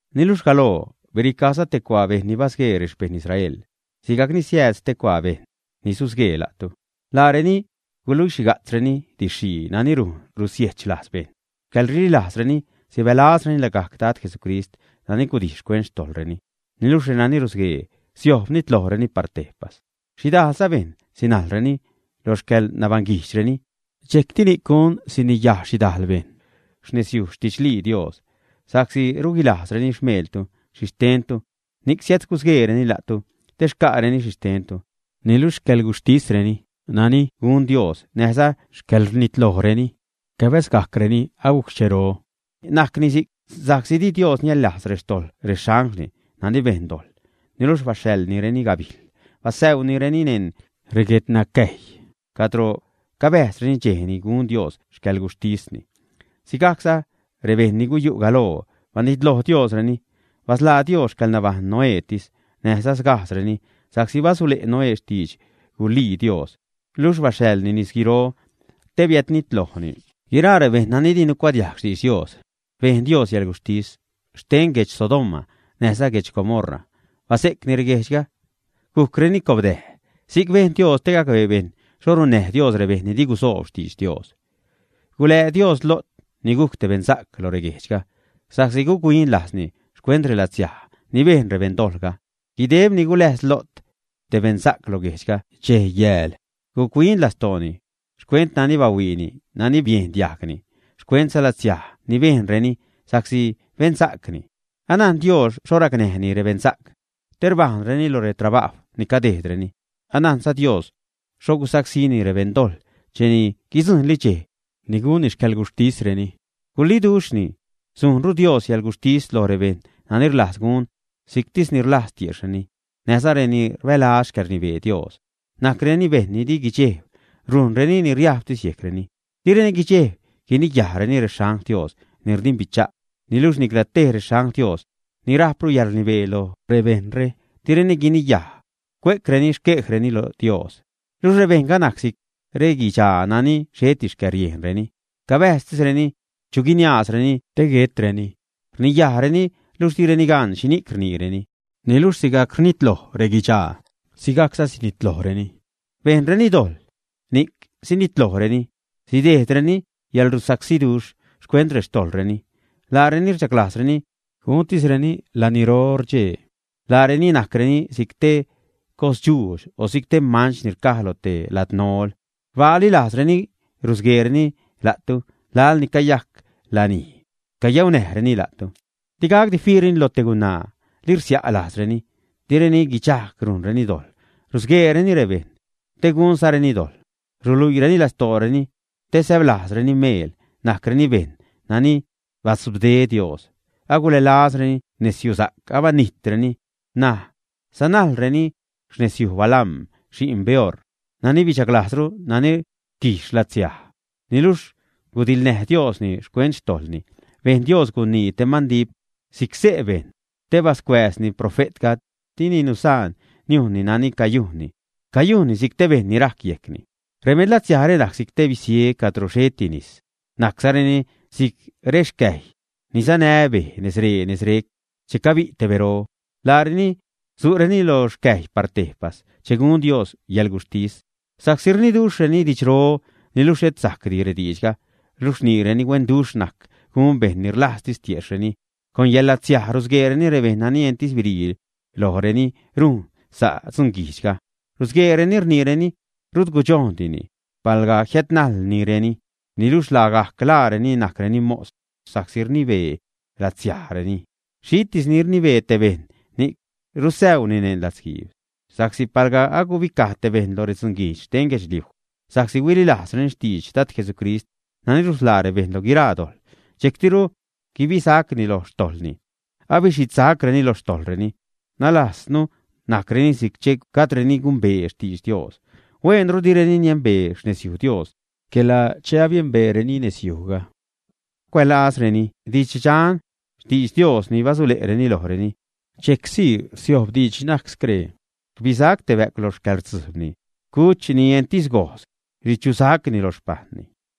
Niluxh galoo biricajza te cuaa bejṉ ni basguee rexpejṉ Israel, sigajcni siääd stee cuaa bejṉ ni susguee la'tu. Laareni guluixhiga'tzreni didx-xhii nani rujn rusiejxh lajz bejṉ xcäḻrililajzreni, sibälazreni lagajc Dad Jesucrist nani gudijx xcuent xtojḻreni. Niluxh renani rusguee, siojb nitlojreni par tejpas. Xhidajlza bejṉ sinajlreni lo xcäḻnabaṉguijdxreni, dxejcti ni'c gun siniyaj xhidajl bejṉ xnezyuj xtidxlii Dios. Sa'csi ruguilajzreni xmeeltu, xhixtentu, ni'c siädgusgueereni la'tu te xca'reni xhixtentu. Niluxh xcäḻgujxhtisreni nani gun Dios, näjza xcäḻrnitlojreni cabäzgajcreni agujc xchero. Najcni si'c sa'csi di Dios niäḻlajz rextojḻ rexanglni nani bejn dojḻ, niluxh baxhaḻnireni gabijl, basäunireni neṉ reguednacäjy cadro cabäjzreni dxej ni gun Dios xcäḻguxhtisni. Sigajcza rebejṉ ni guyu' galoo, banitloj Diosreni, basḻaa Dios xcäḻnabajṉ Noétis näjza sgajdzreni, sa'csi basule' Noé xtidx guluii Dios. Luxh baxhaḻni nisguiro te biädnitlojni guiraa rebejṉ nani di nucuadiajg xtidx Dios. Bejn Dios yäḻguxhtis xten guedx Sodoma näjza guedx Gomorra, base'cni reguejdxga, gujcreni cobdäj. Si'c bejn Dios te gacbee bejṉ xho runnäj Dios rebejṉ ni di gusoob xtidx Dios. Gulää Dios Lo't ni gujc te beṉsa'c lo reguejdxga, sa'csi guc-huin lajzni xcuent relatsiaj ni bejn rebeṉdojḻga. Guideb ni guläjs Lo't, te beṉsa'c, lo guejdxga, dxej, yääl guc-huin lastooni xcuent nani bahuiini, nani biejn diajgni, xcuentza latsiaj ni bejnreni, sa'csi beṉsa'cni. Anajn Dios xho racnäjni rebeṉsa'c te rbäänireni lo retrabajw ni cadejdreni, anajnza Dios xho gusacsíni rebeṉdojḻ cheni guidzujṉli dxej ni gunni xcäḻguxhtisreni. Guliduxhni, sujnru Dios yäḻguxhtis loj rebejṉ nani rlajz gun si'ctisni rlajz tiejxhreni, näjza renani rbälaz xcäḻrnibee Dios. Najcreni bejṉ ni di guidxejb, rujnreni ni riajbtis yejcreni, direni guidxejb guiniyajreni rexangl Dios ni rdimbicha'. Niluxh nicla tej rexangl Dios ni rajpru yäḻrnibee lo rebejṉre, direni guiniyaj, cue'creni xquejreni lo Dios. Luxh, rebejṉga najc si'c reguidxaa nani xheti xcäriejnreni, cabäjztisreni chu guiniaazreni te guetreni. Rniyajreni luxh direni gan xhini'c rniireni. Niluxh sigajc rnitloj reguidxaa, sigajcza sinitlojreni. Bejnreni dojḻ, ni'c sinitlojreni, sidejdreni yälrusacsiduxh xcuent rextojḻreni. Laareni rchaglajzreni guntisreni laniro rdxee. Laareni najcreni si'c te cosdxuudx o si'c te manch ni rcaj lo te ladnol, rbaali lajzreni rusgueereni la'tu laḻ ni cayajc lanij cayaunäjreni la'tu. Digacdi fiireni loj te gunaa, li rsia' lajzreni, direni guidxajg rujnreni dojḻ, rusgueereni rebejṉ te gunzareni dojḻ, ruluiireni lastooreni te säblajzreni meel, najcreni bejṉ nani batzubde Dios, agulälazreni nezyusa'c, abanijtreni, ṉaj sanajlreni xnezyuj Balaam, xi'n Beor, nani huichaglajzru nani rquijx yäḻlatsiaj. Niluxh gudiḻnäj Diosni xcuent xtojḻni, bejn Dios gunii te mandip si'c xse' bejṉ, te bascuääzni profe'tga, dini nusaan niujnni nani cayujnni, cayujnni si'c te bejṉ ni rajc yejcni. Rebeṉ latsiajre najc si'c te bisie cadro xheti nis, najczareni si'c rexcäjy ni sanä bej nezree nezrec che cabi' te bero. Laareni su'reni lo xcäjy par tejpas che gun Dios yäḻguxhtis. Sa'csi rniduxhreni didxro, niluxh xhet sajcdi rediidxga luxh rniireni huenduxh najc gun bejṉ ni rlajztis tiejxhreni, con yäḻlatsiaj rusgueereni rebejṉ nani entis birii loj reni rujn sa' dzunguijdxga. Rusgueereni, rniireni rut gudxojndini palga jiädnajlnireni, niluxh lagajc laareni najcreni mos, sa'csi rnibee latsiajreni. Xhitis ni rnibee te bejṉ, ni'c rusäuni neṉ latzguiib. Sa'csi palga agubicaj te bejṉ loj redzunguijdx xten guedxliuj sa'csi huililajzreni xtidx Dad Jesucrist nani rusḻaa rebejṉ lo guiraa dojḻ, dxejctiru gubisacni loj xtojḻni, abixhidsacreni lo xtojḻreni, nalajz najcreni si'c che gajdreni gumbee xtidx Dios. Huenru direni niembee xnezyuj Dios, quela che abiembeereni nezyujga, cuälazreni didx dxan, xtidx Dios ni basule'reni lojreni. Dxejcsii rsiojb diidx ni najc scree: “Rbisac te bä'cw loj xcäḻrdzujbni. Cuch ni entis gojz richusacni lo xpajṉni.”